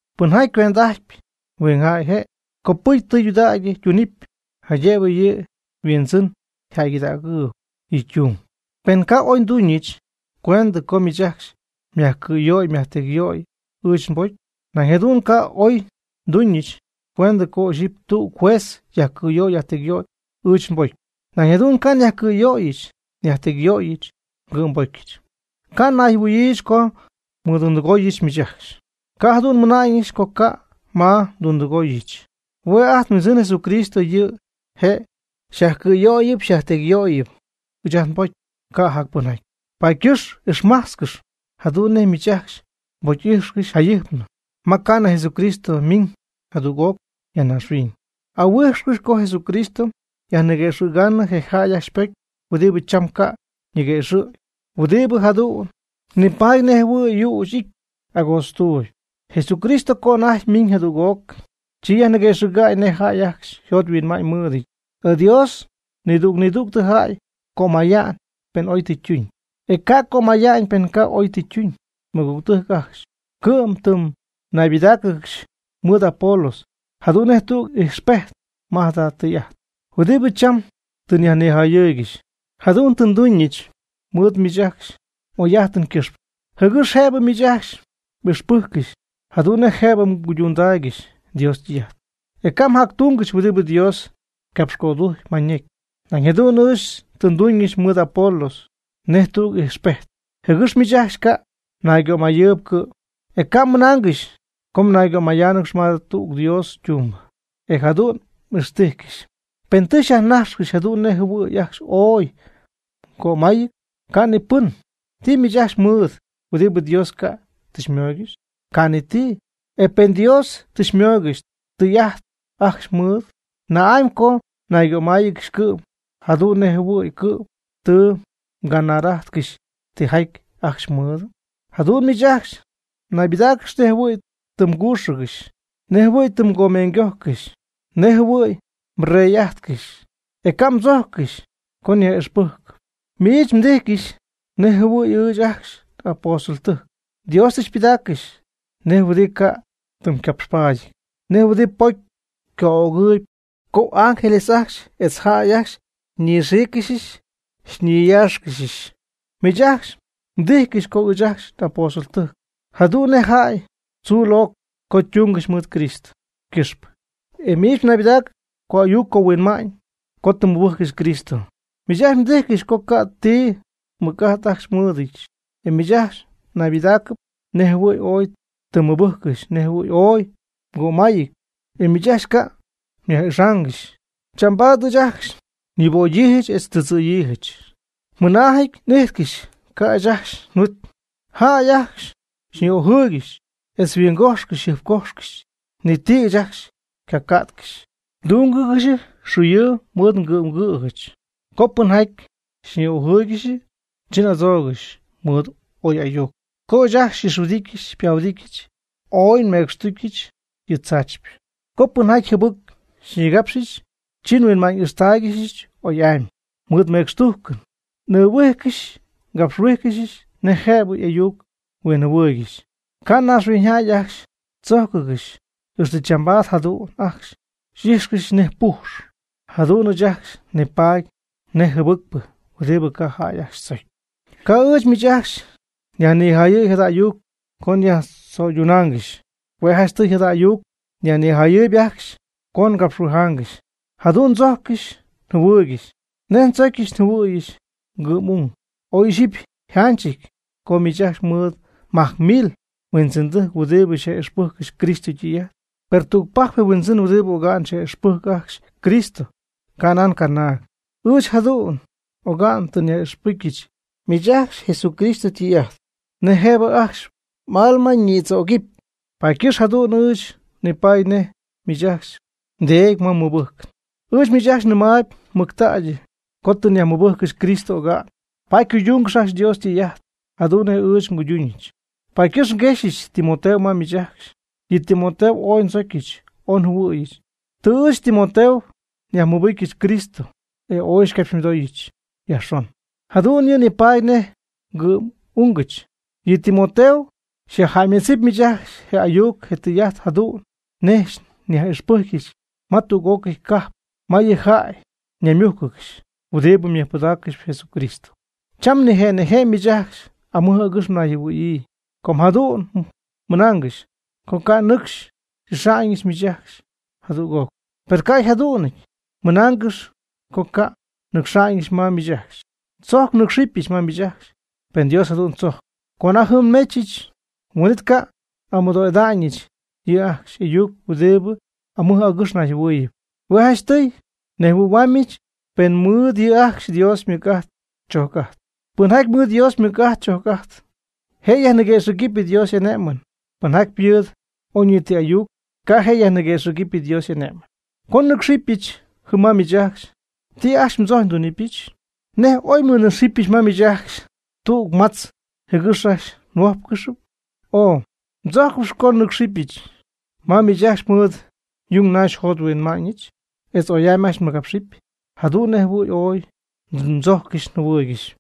Pɨnjaty cuend'ajtp huingjäy yje', copɨcy tɨydudägy ytunɨpy, jaydëbɨ yɨ' yhuindzɨn yjäygɨdägɨɨyb yɨ' ytung. Per ca' ooy nduñɨch cuendɨ co miich ajcxy xyajcɨ̈yöy xyajtecyyöyɨ ɨɨch nbocy. Nañ jadu'n ca' ooy nduñɨch cuendɨ co ixyipy tüg juez yajcɨ̈yöy yajtecyyöyɨ ɨɨch nbocy. Nañ jadu'n ca' nyajcɨ̈yöyɨch nyajtecyöyɨch ngɨ'mbocyɨch. Ca' nayjɨhuɨ̈yiijɨch co nmɨdundɨgooyɨch miich ajcxy. Ca' jadu'n nmɨna'ñɨch co ca' ma ndundɨgooyɨch. Hue' ajt nHuindzɨn Jesucristo yɨ' je' xyajcɨ̈yöyɨp xyajtecyyöyɨp ɨɨch nbocy, ca' jac pɨnjaty. Paady ycɨxpɨ ixmajtzcɨx jadu'n nej miich ajcxy xypocy'ijxcɨxy jayɨjpnɨ ma ca'nɨ Jesucristo ymiñ jadüg'oc ya naaxhuiñ. Ahuijxcɨx co Jesucristo yajniguëxɨ̈gaanɨ je jäy ajcxy ypocy huɨdibɨ cham ca' ñiguëxɨ̈gy, huɨdibɨ jadu'n nipaady nej jɨhuɨ̈y yüch y'ity agootztuuby. Jesucristo co anajty ymiñ jadüg'oc, chi yajniguëxɨ̈gɨpy nej jäy ajcxy yjot yhuinma'ñ mɨɨdɨty. E Dios nidüg nidüg jäy cömaya'ñ pen oy tɨ ytuñ, e ca' cömaya'ñ pen ca' oy tɨ ytuñ. Mɨgügtɨjc ajcxy, cɨ'm tɨ naybɨdägyiiyjɨch mɨɨd Apolos jadu'n nej tüg ijxpejt ma jada tɨy'ajt huɨdibɨ cham tɨ nyajnijayɨɨygɨxp. Jadu'n tɨ nduñɨch mɨɨd miich ajcxy m'oy'ajtɨn ycɨxpɨ, jɨgɨx jëbɨ miich ajcxy m'ixpɨjccɨxy jadu'n nej jëbɨ mguydundaygɨxy Dios ytɨy'ajt, e ca' mjactungɨxy huɨdibɨ Dios ycapxcödujc ma ñecy. Nañ jadu'n ɨɨch tɨ nduñɨch mɨɨd Apolos nej tüg ijxpejt, jɨgɨx miich ajcxy ca' mnaygömayɨɨyb cɨ'm, e ca' mmɨnaangɨxy co mnaygomájtzɨgɨxy ma tüg Dios ytumbɨ, e jadüg m'ixtijcɨxy. ¿Pɨn tɨ xyajnajxcɨxy jadu'n nej jɨhuɨ̈y ajcxy ooy mgömayɨty? Ca' ni pɨn. ¿Ti miich ajcxy mɨɨdɨty, huɨdibɨ Dios ca' tɨ xymooygɨxy? Ca' ni ti. E pen Dios tɨ xymooygɨxy tijaty ajcxy mmɨɨdɨty, ¿na'amy co mnaygömáyɨgɨxy cɨ'm, jadu'n nej jɨhuɨ̈y cɨ'm tɨ mganar'ajtcɨxy tijaty ajcxy mmɨɨdɨty? Jadu'n miich ajcxy mnaybɨdáacɨgɨxy nej jɨhuɨ̈y tɨ mgüxɨgɨxy, nej jɨhuɨ̈y tɨ mgomeeñygojcɨxy, nej jɨhuɨ̈y mrey'ajtcɨxy, e ca' mdzojccɨxy co nyaj'ixpɨgɨpyɨch. Miich xytíjcɨxyɨch nej jɨhuɨ̈y ɨɨch ajcxy apóstoltɨjc Dios tɨ xypɨdaaccɨxɨch nej huɨdibɨ ca' ytɨmcapxpaadyɨty, nej huɨdibɨ ypocy co'ögɨɨyb, co ángeles ajcxy etz jäy ajcxy xyñixíiccɨxyɨch xyñiyáaxcɨxyɨch. Miich ajcxy xytíjcɨxyɨch co ɨɨch ajcxy apóstoltɨjc jadu'n nej jäy tzuu locɨp co ndúngɨxyɨch mɨɨd Cristo ycɨxpɨ. E miich mnaybɨdáacɨgɨxy co'ayuc cohuinma'ñ co tɨ mmɨbɨjccɨxy Cristo. Miich ajcxy xytíjcɨxyɨch co ca' ti mɨc'ajt ajcxy mɨɨdɨdyɨch, e miich ajcxy mnaybɨdaacɨp nej jɨhuɨ̈y ooy tɨ mmɨcpɨjccɨxy, nej jɨhuɨ̈y ooy mgömayɨty, e ɨɨch ajcxy ca' nyaj'ixaangɨxyɨch. Chambaad ɨɨch ajcxy nyuubögyiijɨch etz ndɨdzɨ̈yiijɨch. Mɨnaajɨty n'íjtcɨxyɨch ca' ɨɨch ajcxy nhuit. Jäy ajcxy xyñi'ojɨɨygɨxɨch etz xyhuingojxy xyjɨjpcójxcɨxɨch, ni ndɨjc ɨɨch ajcxy ycaca'tcɨxy. Ndúngɨxyɨch xuuyɨɨ mɨɨd ngɨ'm ngɨ̈jɨch. Co pɨnjaty xyñi'ojɨɨygɨxyɨch, chi n'adzóogɨxyɨch mɨɨd oy ayuc. Co ɨɨch ajcxy xy'ixhuɨdityɨch xypahuɨdityɨch, ooy nmecxtújccɨxyɨch yɨ tzaachypɨ. Co pɨnjaty jɨbɨc xyñigápxcɨxyɨch, chi huinma'ñ ixtáaygɨxyɨch oy'amy mɨɨd mecxtujcɨn n'ɨɨhuíjcɨxyɨch ngapxhuíjcɨxyɨch nej jëbɨ y'ayuc-huinjɨhuɨɨygɨxy. Ca' naaxhuiñyjäy ajcxy xychójccɨxyɨch. Ixtɨ chambaad jadu'n ajcxy xy'íjxcɨxyɨch nej püx, jadu'n ɨɨch ajcxy nipaady nej jɨbɨcpɨ huɨdibɨ ca' jäy ajcxy tzocy. Ca' ɨɨch miich ajcxy nyajnijayɨ̈y jada ayuc co nyajtzöydunaangɨxy. Hue' janchtɨy jada ayuc nyajnijayɨɨyb ajcxy co ngapxhuijáangɨxy. Jadu'n ndzojccɨxy njɨhuɨɨygɨxy nej ndzocyɨch njɨhuɨ̈yɨch ngɨ'm'ung. Oy ixyipy yjanchɨty co miich ajcxy mɨɨd majc mil huindzɨndɨjc huɨdibɨ xyaj'ixpɨjccɨxy Cristo ytɨy'ajt. Per tügpajcpɨ je mhuindzɨn huɨdibɨ oga'n xyajmɨbɨjcy ajcxy Cristo, ca' nan canaag. Ɨɨch jadu'n oga'n tɨ nyaj'ixpɨcyɨch miich ajcxy Jesucristo ytɨy'ajt nej jëbɨ ajcxy m'alma ñïdzögɨpy. Paady ycɨxpɨ jadu'n ɨɨch nipaady nej miich ajcxy mdeedy ma mmɨbɨjcɨn. Ɨɨch miich ajcxy nɨmaayb mɨctägy, com tɨ nyajmɨbɨjccɨxy Cristo oga'n, paady cuydungɨx ajcxy Dios ytɨy'ajt, jadu'n nej ɨɨch nguyduñɨch. Paady ycɨxp nguexyɨch Timoteo ma miich ajcxy. Yɨ Timoteo ooy ndzocyɨch ooy njɨhuɨ̈yɨch. Tɨ ɨɨch Timoteo nyajmɨbɨcyɨch Cristo, e ooy xycapxymɨdooyɨch yajxon, jadu'n yɨ' nipaady nej ngɨ'm'ungɨch. Yɨ Timoteo xyajjäymedzɨp miich ajcxy je ayuc je tɨy'ajt jadu'n nej nyaj'ixpɨcyɨch ma tüg'ócɨy cajp ma yɨ jäy ñaymújcɨgɨxy huɨdibɨ mɨjpɨdaaccɨxp Jesucristo. Cham nije' nije' miich ajcxy amɨj agɨx mnayjɨhuɨ̈yii co jadu'n mɨnaangɨxy co ca' nɨcxy n'ixa'ñɨch miich ajcxy jadüg'oc. Per ca' jadu'n mmɨnaangɨxy co ca' nnɨcxa'ñɨch ma miich ajcxy. Tzojc nɨ́cxɨbɨch ma miich ajcxy, pen Dios jadu'n tzojcp. Co anajty jɨm nmechɨch, huin'it ca' n'amɨdoo'ida'ñɨch yɨ' ajcxy y'ayuc huɨdibɨ amɨj agɨx nayjɨhuɨɨyɨp. Hue' janchtɨy nejhuɨ̈hua'ñɨch pen ymɨɨd yɨ' ajcxy Dios ymɨc'ajt chög'ajt. Pɨnjaty mɨɨd Dios ymɨc'ajt Dios chög'ajt, je' yajniguëxɨ̈cp Dios y'ane'mɨn. Pɨnjaty mɨɨd oyñiti ayuc, ca' je' yajniguëxɨ̈gɨp Dios y'ane'mɨn. Co nnɨ́cxɨbɨch jɨm ma miich ajcxy, ¿ti ajcxy mdzojccɨxyp ndunɨpyɨch? ¿Nej oy nmɨnɨ́cxɨbɨch ma miich ajcxy tüg matz jɨgɨx ajcxy nhuójpcɨxɨpy? o ¿Mdzojccɨxyp co nnɨ́cxɨbyɨch ma miich ajcxy mɨɨd yungnaxy njot nhuinma'ñɨch, etz oy'amy ajcxy nmɨgapxɨpy, jadu'n nej jɨhuɨ̈y ooy ndzojccɨxy njɨhuɨɨygɨxy?